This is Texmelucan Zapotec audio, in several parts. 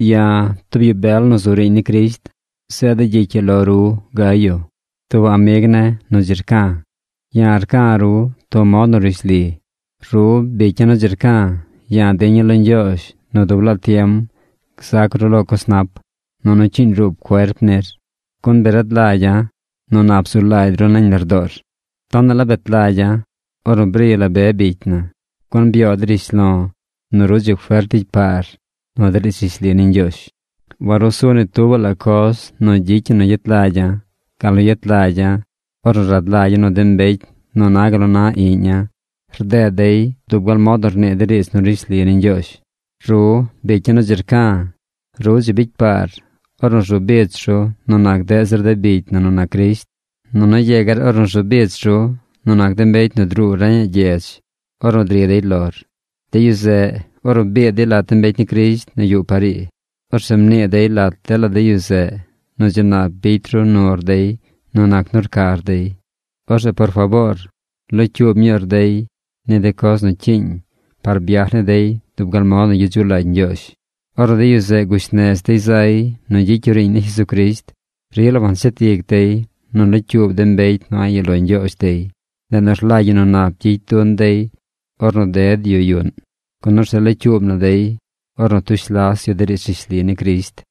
Ya̱, tub yu bel nu zu riiñ ni Crisht, zeeda̱ gyicy ii lo ru Gayo, tub amig ne̱ nu dzi rca̱. Ya̱ rca̱ ru tub mod nu rishli. Ru, bicya̱ nu dzi rca̱, ya̱ diña̱ lo Ñgyoozh nu dub laa tiem gzac ru lo coz nap, nunu cyiiñ ruub cuerp nir. Gun bi rad lagya̱ nu nap zu lagy ru nañ lardoor. Tonaꞌ la bet lagya̱ ornu bri la be bicy na, gun byoo dey rishlo̱ nu ru dzi fert ricy paar nu de riidz rishli ni Ñgyoozh. Warusu ni tuubaꞌ la coz nu gyicy ñi nu gyet lagya̱ gal nu yet lagya̱ ornu rad lagya̱ nu de mbecy nu na gal nu na iꞌña̱ rded dey dub gal mod nu rnii de riidz nu rishli ni Ñgyoozh. Ru, bicya̱ nu dzi rca̱, ru dzi bicy paar ornu rzu bich ru nu nac deꞌ zir de bicy na nu nac Crisht nunu yegar ornu rzu bich ru nu nac de mbecy nu druu reñaꞌ gyedz ornu dri dey lor. De yu zeꞌ, ornu biid dey lat de mbecy ni Crisht nu yuꞌ par ii, orzeꞌ mnii dey lat dela de yu zeꞌ nu dzi nap bicy ru nur dey nu nac nu rcar dey. Orzeꞌ por faboor locyuub ñuur dey ni de coz nu cyiiñ par byaj ni dey dub gal mod nu gyedzuꞌ lagy Ñgyoozh. Ornu de yu zeꞌ gush nez dey zay nu gyicy yu riiñ ni Jesucrisht, rila wanshet ic dey nu nlocyuub de mbecy nu a̱ꞌ yuꞌ lo Ñgyoozh dey. Ndeꞌ nu rlagy ñi nu nap gyicy dun dey ornu ded yu yuꞌn, gun orzeꞌ locyuub na dey ornu tush las yu de riidz rishli ni Crisht.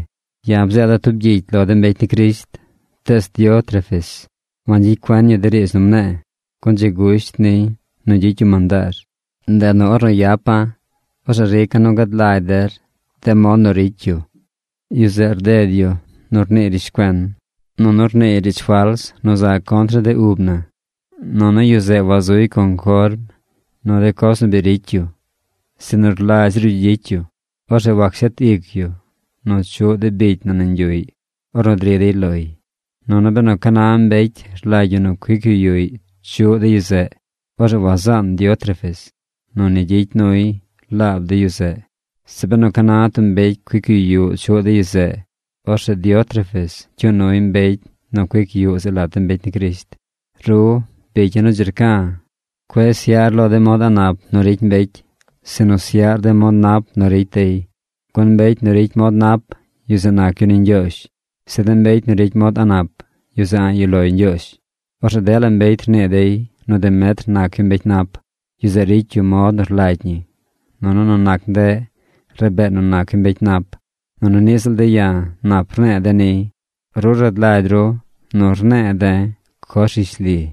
Ya̱ bzeeda̱ tub gyicy lo de mbecy ni Crisht, tees Diótrefes wangyicy cuen yu de riidz nu mne̱e̱, gun dzi gusht niy nu gyicy yu mandaar. Ndeꞌ nu ornu yapa̱, orzeꞌ rica̱ nu gad lagy der de mod nu ricy yu. Yu zeꞌ rded yu nu rniiy rishcuen. Nunu rniiy riidz fals nu za contr ni de ub na. Nunu yu zeꞌ wazuy conform nu de coz nu bi ricy yu, sinu rlagy zir yu gyicy yu. Orzeꞌ wacshet ic yu nu chuꞌ de bicy na nañ yuꞌy ornu dri dey loy. Nunu benu ca na mbecy rlagy yu nu cuic yu yuꞌy chuꞌ de yu zeꞌ, orzeꞌ wazaan Diótrefes nu ni gyicy nuy laab de yu zeꞌ. Zeꞌ benu ca na tub mbecy cuic yu yuꞌ chuꞌ de yu zeꞌ, orzeꞌ Diótrefes cyuu nuy mbecy nu cuic yuꞌ zeꞌ lat de mbecy ni Crisht. Ru, bicya̱ nu dzi rca̱, cueꞌ syaꞌr lo de mod a̱ꞌ nap nu ricy mbecy, sinu syaꞌr de mod nap nu ricy dey. Gun mbecy nu ricy mod nap, yu zeꞌ nac yu ni Ñgyoozh. Zeꞌ de mbecy nu ricy mod a̱ꞌ nap, yu zeꞌ a̱ꞌ yuꞌ loy Ñgyoozh. Orzeꞌ dela mbecy rnii dey nu Demetr nac yu mbecy nap. Yu zeꞌ ricy yu mod nu rlagy ñi, nunu nu nac ndeꞌ rabee nu nac yu mbecy nap. Nunu niꞌ ziꞌl de̱ ya̱ nap rne̱e̱ de̱ niy. Ru rad lagy ru nu rne̱e̱ de̱ coz rishli.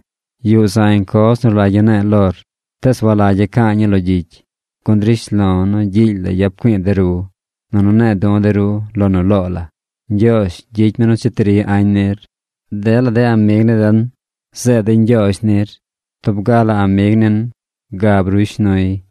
Yuꞌ zañ coz nu rlagya̱ ne̱e̱ lor, tees walagya̱ ca̱a̱ ñii lo gyicy, gun drish lo̱ nu gyiily la yap güi̱i̱ de ru, nunu ne̱e̱ du̱ de ru lo nu loo la. Ñgyoozh gyicy mi nu cheti ri añ nir. Dela de amig ni den zeed dey ñgyoozh nir. Tub ga la amig nin gab ruy shnuy.